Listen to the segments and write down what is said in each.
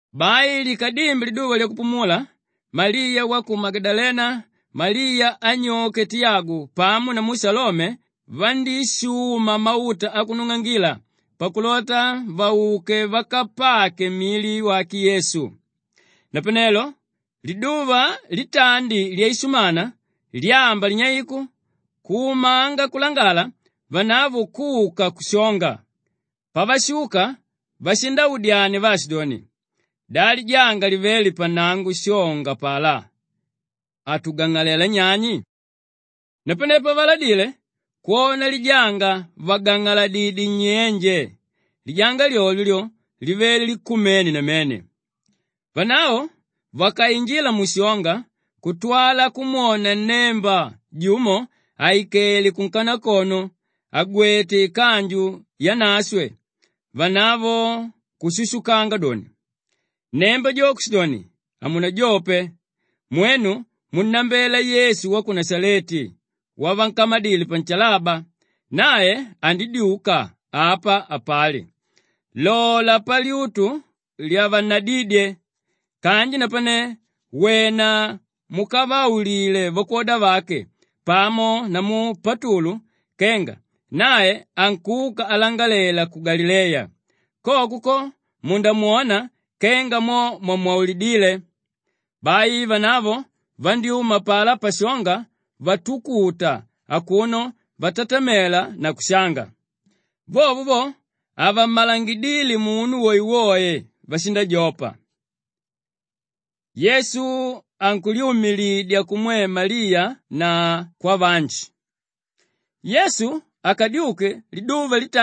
Bai likadimbe liduva lyakupumula, Maliya wa ku Magadalena, Maliya anyoke Tiyagu pamo namu Shalome vandíshuma mauta akunung'angila pakulota vauke vakapake mili wake Yesu. Napanelo liduva litandi lyaishumana, lyamba linyeiku, kumanga kulangala, vanavo kuka kushonga. Pavashuka vashindaudyania vaashidoni, “Da lijanga livéle pannango pashonga apalá, atugang'alela nyani?” Napane pavaladile kwona lijanga vàgang'aladidye nnyenje, lijanga lyolyo lyo livele likumene namene. Vanavo vakainjila mushonga kutwala kumwona nnemba jumo àikele kunkanakono, àgwete ikanju yanashwe, vanavo kushushukanga doni. Nnemba jo kushidoni, “Hamunajope! Mwenu munnambela Yesu wa ku Nashaleti wavankamadile panshalaba. Nae andidyuka, apa hapali. Lola palyutu lyavannadídye. Kanji napane, wena mukavaulile vakwoda vake pamo namu Patulu kenga nae ankuka alangalela ku Galileya. Koko ko, mundamwona kenga mo mwamwaulidíle.” Bai vanavo vandyúma apalá pashonga vatukuta akuno vatatamela na kushanga. Vovo vo, havammalangidíle munu woewoe, vashindajopa. Yesu ankulyumilidya kumwe Maliya na kwavanji Maandiko akala-uti inamba idikidiki ya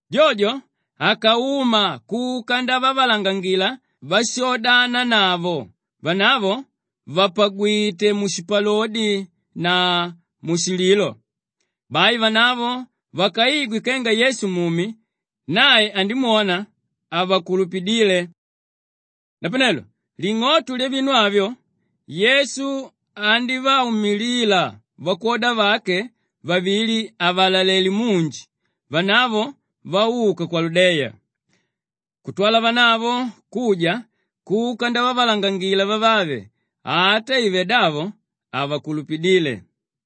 Jojo akauma kuka ndavavalangangila váshoodananavo, vanavo vàpagwite mushipalodi na mushililo. Bai vanavo vakaigwe kenga Yesu mumi, nae andimwona, havakulupidíle. Napanelo ling'oto lyavinu avyo Yesu andívaumilila vakwoda vake vavili àvalalele munji vanavo vauka kwaludeya. Kutwala vanavo kuja kuka ndavavalangangila vavave, ata ive davo havakulupidíle.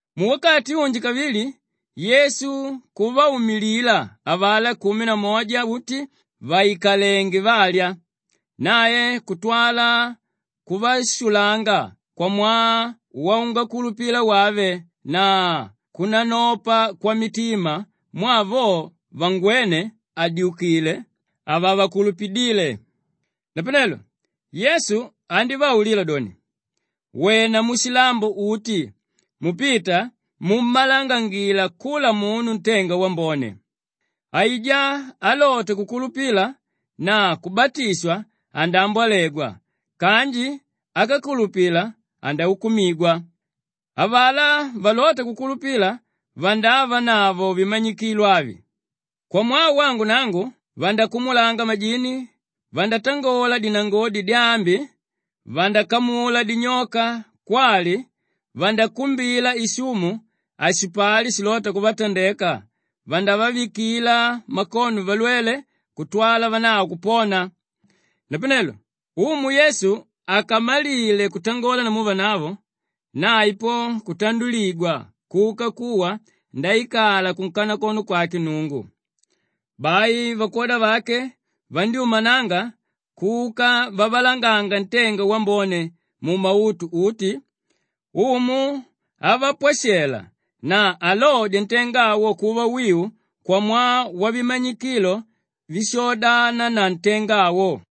Muwakati unji kavili Yesu kuvaumilila avalá kumi na moja uti vàikalenge valya. Nae kutwala kuvashulanga kwamwaa waungakulupila wave na kunanopa kwamitima mwaa vo vangwéne àdyukile, havavakulupidíle. Napanelo Yesu andívaulila doni, “Wena mushilambo uti mupita mummalangangila kula munu ntenga wambone. Aijá álota kukulupila na kubatishwa, andaambwalegwa kanji ákakulupila, andaukumigwa. Avalá valota kukulupila vandavanavo vimanyikilo avi: kwamwaa wangu nangu vandakumulanga majini, vandatangola dinangodi dyaambi, vandakamula dinyoka kwali vakakumbila ishumu, hashipali shilota kuvatandeka, vandavavikila makono valwele kutwala vanavo kupona.” Napanelo Umu Yesu akamalile kutangola namu vanavo, nae po kutanduligwa kuka kuwa ndaikala kunkanakono kwake Nnungu. Bai vakwoda vake vandyúmananga kuka vavalanganga ntenga wambone mumautu uti, Umu avapwashela na alodya ntenga awo kuva wiu kwamwaa wavimanyikilo víshoodana na ntenga awo.]